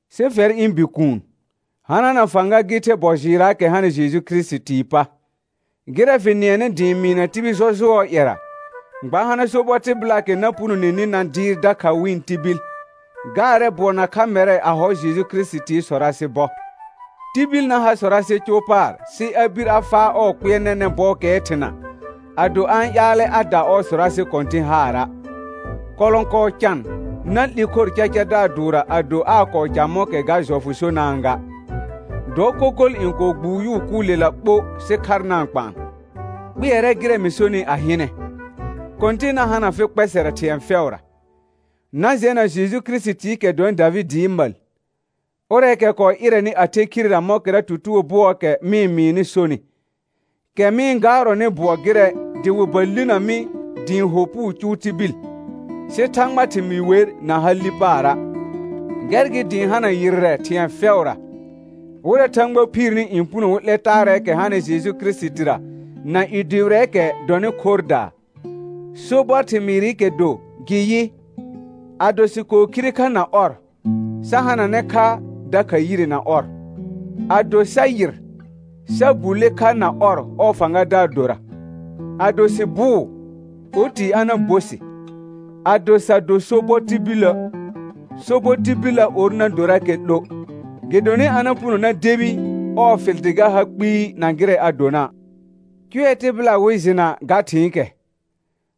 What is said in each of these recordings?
Sɩ fɛr ɩ̃ bikuun, hanana fãga gɩ the bɔ jɩɩrraakɛ hanɩ Jeju Kirisitii pa. Gɩrɛ fɩ nɩɛnɩ dɩ ɩ̃ mɩɩna tibil jɔjʋɔɔ ƴɛra, gba hana sobɔ tɩbɩlaakɛ na punoneni na dɩɩr dakha wɩ̃ tibil. Gaarɛ bʋɔ nakha mɛrɛ a hɔ Jeju Kirisitii sɔrasɩ bɔ. Tibil na ha sɔrasɩ cʋʋ paar sɩ a bir a faa ɔɔ kpɩɛr nɛnɛ̃ bɔɔkɛɛ thɩna, ado a-n ƴaalɛ a da ɔɔ sɔrasɩ kɔ̃tɩ̃ haara'. Kɔlɔ̃kɔɔ can na 'li khor cacadaar dʋʋrra ado aa kɔɔ ca mɔ̃kɛ ga jɔfʋ sonaa ga. Dɔ kokol n kɔɔ gbʋʋ yʋʋ kʋʋlɛla ɓo sɩ khar na-n kpaan. Kpɩɛrɛ gɩrɛ mɩ sonɩ a hɩnɛ; Kɔ̃tɩn na hana fɩ kpɛsɛrɛ thɩ̃ɛ fɛʋra. Na jɛna Jeju Kirisitiikɛ dɔnɩ Davɩdɩɩ məl, ʋrɛɛkɛ kɔɔ ɩrɛnɩ a the khirera mɔ̃kɛra tutugo bʋɔɔkɛ mɩ-n mɩɩnɩ sonɩ, kɛ mɩ-n gaarɔnɩ bʋɔ gɩrɛ dɩ wɩ ba linə mi dɩ ɩ̃ ho puu cʋʋ tibil, sɩ Thãgbaa thɩmɩɩ wer na ha li paara'. Gɛr gɩ dɩ ɩ̃ hana yɩrrɛ thɩ̃ɛ fɛʋra, wɩrɛ Thãgba phiirni n puno wɩ 'lɛ taarɛɛkɛ hanɩ Jeju Kirisitira na i dʋbɩrɛɛkɛ dɔnɩ khorrdaa. Sobɔr thɩmɩɩrɩkɛ do gɩ yɩ: «Ado sɩ kɔɔ khire kha na ɔr, sa hananɛ kha dakha yire na ɔr. Ado sa yɩr, sa bulle kha na ɔr ɔɔ fãgadaar dora. Ado sɩ bʋʋ, oti a na bo sɩ. Ado sa do sobɔ tibilə', sobɔ tibillə or na dorakɛ 'lo, gɩdonɩ a na puno na debi ɔɔ fɩl dɩ ga ha kpɩɩ na gɩrɛ a dona'.» Cʋɛ tɩbɩla wɩ jɩna ga thɩ̃ɩkɛ,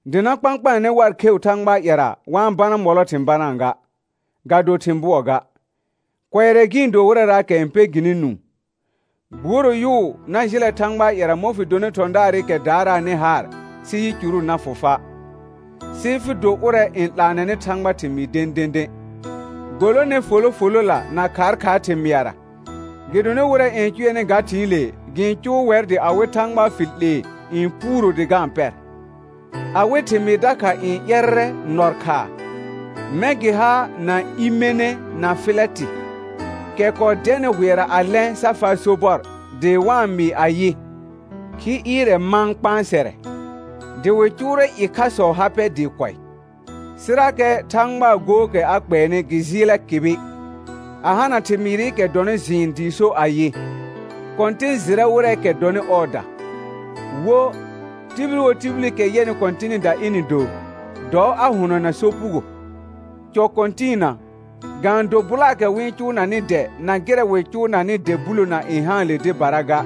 dɩ na kpãkpaanɛ war kheu Thãgbaa ƴɛra wa-n bana mɔlɔ thɩ̃ banaa ga, ga do thɩ̃ bʋɔ ga, kʋɛrɛ gɩ-n do wɩrɛraakɛ n pɛ gɩnɩ nũu. Gbuoro yʋʋ na jɩlɛ Thãgbaa ƴɛra mɔ̃ fɩ donɩ thɔ̃daarɩkɛ daaraanɩ haar sɩ yicuru na fʋ fa', sɩ fɩ do ʋrɛ n 'laanɛnɩ Thãgbaa thɩmɩɩ dẽdẽdẽ. Golone folo folola na khaakhaar thɩmɩara, gɩdonɩ wɩrɛ n cʋɛnɩ ga thɩ̃ɩle gɩ-n cʋʋ wɛr dɩ awɩ Thãgba fɩl 'lee n puuro dɩ ga-n pɛr. Awɩ thɩmɩɩ dakha n ƴɛrrɛ nɔr khaa, mɛ̃ gɩ ha na Imene na Fɩlɛtɩ, kɛ kɔɔ dɛnɩ hʋɛra a lɛ̃ sa faa sobɔr dɩ wa-n mɩɩ ayɩ: Khi ɩɩrɛ mãa kpãsɛrɛ; dɩ wɩ cʋʋrɛ ɩkhasɔɔ ha pɛ dɩɩ kʋɛ. Sɩrakɛ Thãgbaa gookɛ a kpɛɛnɩ gɩ jɩɩlɛ kɩbɩ, a hana thɩmɩɩrɩkɛ dɔnɩ jɩɩn dɩɩ so ayɩ: «Kɔ̃tɩn jɩrɛ wɩrɛɛkɛ dɔnɩ ɔɔda.» Wo: «Tibil wo tibilikɛ yɛnɩ Kɔ̃tɩnɩda ɩnɩ do, dɔ a hʋnɔna sopugo.» Cɔ kɔ̃tɩɩna, ga-n do bʋlaakɛ wɩ cʋʋnanɩ dɛ na gɩrɛ wɩ cʋʋnanɩ dɛ bulona n haanle dɩbara ga,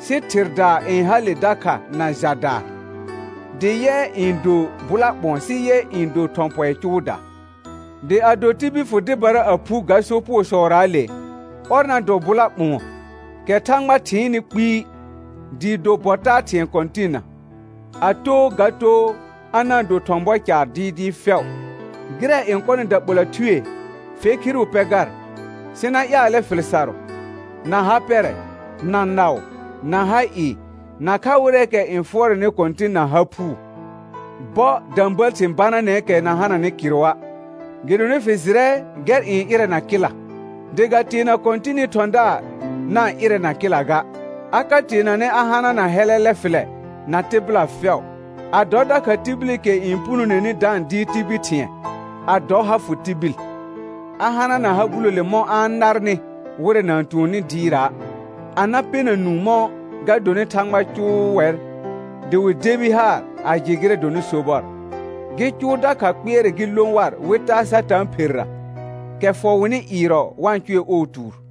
sɩ thɩrdaa n hale dakha na jadaa, dɩ yɛ n dor bʋla ɓʋ̃ɔ sɩ yɛ n do thɔ̃ pɔɩ cʋʋdaa. Dɩ ado tibil fʋ dɩbara a phu ga sopugosɔraale, ɔr na dɔ bʋla ɓʋ̃ɔ, kɛ Thãgba thɩɩnnɩ kpɩɩ, dɩɩ do bɔ taa thɩ̃ɛ Kɔ̃tɩnna, a too ga too a na-n do thɔ̃ bɔ caar dɩɩdɩɩ fɛʋ. Gɩrɛ n kɔnɩ daɓola thue, fe khiru pɛ gar, sɩ na ƴaalɛ fɩl sarʋ, na ha pɛrɛ, na naʋ, na ha ɩɩ, nakha wɩrɛɛkɛ n fʋɔrɛnɩ Kɔ̃tɩn na ha phuu. Bɔ də̃bəəl thɩ̃ bananɛɛkɛ na hananɩ kɩrʋa', gɩdonɩ fɩ jɩrɛ gɛr n ɩrɛna kɩla. Dɩ ga teena Kɔ̃tɩnɩ thɔ̃daar na-n ɩrɛna kɩla ga, a ka teenanɛ a hanana hɛlɛlɛ fɩlɛ na tɩbɩla fɛʋ, a dɔ dakha tibilikɛ n punoneni da-n dɩɩr tibil thɩ̃ɛ; a dɔ ha fʋ tibil, a hanana ha bulole mɔ̃ a-n narnɩ wɩrɛ na-n tuonni dɩɩra', a na pɛna nũu mɔ̃ ga donɩ Thãgba cʋʋ wɛr dɩ wɩ debi haar a jɩ gɩrɛ n dɔnɩ sobɔr, gɩ cʋʋ dakha kpɩɛrɛ gɩ lõ war wɩ taa Satãa pherra, kɛ fɔ wɩnɩ ɩɩrɔ wa-n cʋɛ ɔɔ tuur.